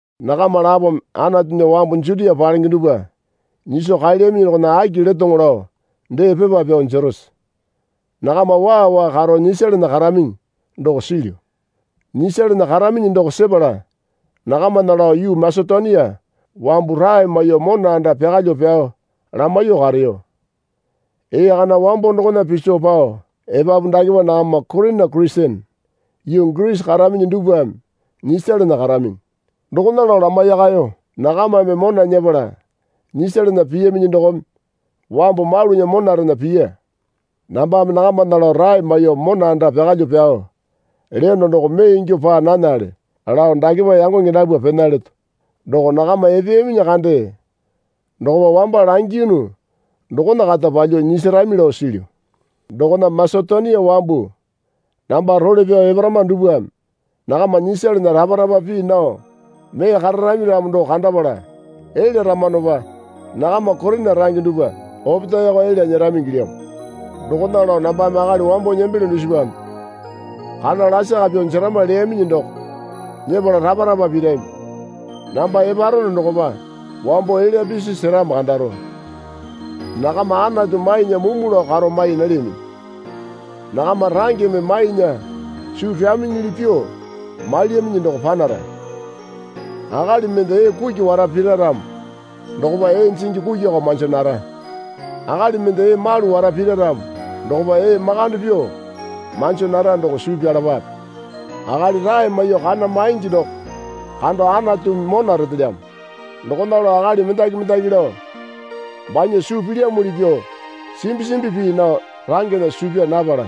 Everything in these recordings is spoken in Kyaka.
Nakama lapome Anatunya wambu Jutia palenge dupwa nyiso kaelyaminyi dokona aki letoŋo lao dee pepa pyao jerose? Nakama waa waa karo nyisalana karaminyi doko silyu. Nyisalana karaminyi doko sepala nakamana lao yuu Masetonia wambu rae maiyuo mona anda pyakalyuo pyao lamaiyuo kareyo. Ee kana wambo dokona piso pao epapu dakepa nakama Korina Kurisene yuu Girisi karaminyi dupwame nyisalana karaminyi, dokona lao lamaiyakayo. Nakamame mona nyepala nyisalana piyaminyi dokome wambu malunya monarena piya. Nambame nakamana lao rae maiyuo mona anda pyakalyuo pyao leyono doko mee ingyuo paa nanale lao dakepa yangonge dapwa pena leto. Doko nakama epeyaminyi kande dokopa wamba langiyunu dokona kata palyuo nyisarami lao silyu. Dokona Masetonia wambu namba role pyao eparama dupwame nakama nyisalana rapa rapa pii nao mee kararami ramo doko kandapala elyaramanopa nakama Korina range dupwa opetaeko elya nyerami ingilyamo. Dokona lao nambame akali wambo nembelyo dusipame kana lasaka pyuo jerama leyaminyi doko nyepala rapa rapa pirami. Namba eparono dokopa wambo elya pisi seramo kandaro. Nakama Anatu mainya mumu lao karo mai nalyaminyi. Nakama rangeme mainya suu pyaminyili pyuo mailyaminyi doko panara. Akali mende ee kuki wara pira ramo dokopa ee jingi kukiko manjo nara. Akali mende ee malu wara pira ramo dokopa ee makande pyuo manjo nara doko suu pyalapape. Akali rae maiyuo kana maingi doko kando Anatumi mona retelyamo. Dokona lao akali mendaki mendaki lao banya suu pilyamuli pyuo simbi simbi pii nao rangena suu pyaa napala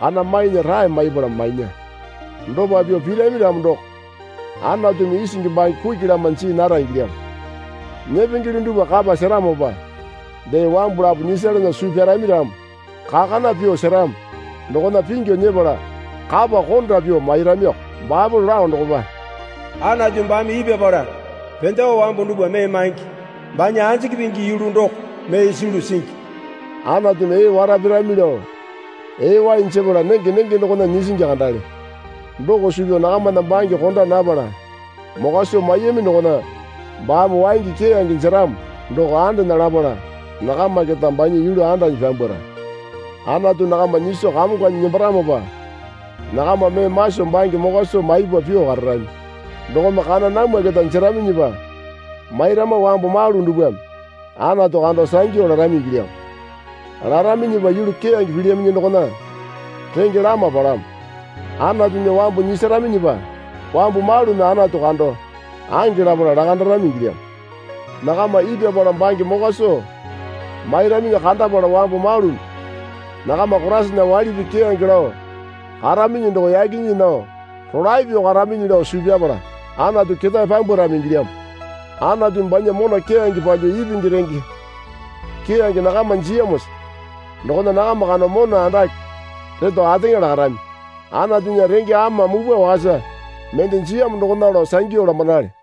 kana mainya rae maipala mainya. Dopa pyuo pirami ramo doko Anatumi isingi bange kuki lama jii nara ingilyamo. Nyepengele dupwa kapa seramopa dee wambu lapo nyisalana suu pyarami ramo kakana pyuo seramo dokona pingyu nyepala kapa konda pyuo mairamioko. Baepole lao dokopa, Anatu baame ipyapala pendewa wambu dupwa mee maingi. Banya anjiki pingi yulu doko mee sulu singi. Anatumi ee wara pirami lao ee wai jepala nenge nenge dokona nyisingi kandale. Doko suu pyao nakamana bange konda napala mokwa soo maiyami dokona baame waingi keyange jeramo doko andena lapala nakama keta banya yulu andanyi pyambwara. Anatu nakama nyiso kamonganyi nembaramopa nakama mee maso bange mokwa soo maipa pyuo kararami. Dokome kana namwa keta jeraminyipa mairama wambu malu dupwame Anatu kando sangyu larami ingilyamo. Laraminyipa yulu keyange pilyaminyi dokona renge lama palamo. Anatunya wambu nyisaraminyipa wambu malumi Anatu kando ange lapala lakandarami ingilyamo. Nakama ipyapala bange mokwa soo mairaminyi kandapala wambu malumi nakama Koraisana waili pii keyange lao karaminyi doko yaki nyii nao rolae pyuo karaminyi lao suu pyapala Anatu ketae pyambwarami ingilyamo. Anatumi banya mona keyange palyuo ipingi renge keyange nakama jiyamosa dokona nakama kando mona andake reto ateŋa lakarami. Anatunya renge ama mupwa wakasa mende jiyamo dokona lao sangyu lamanale.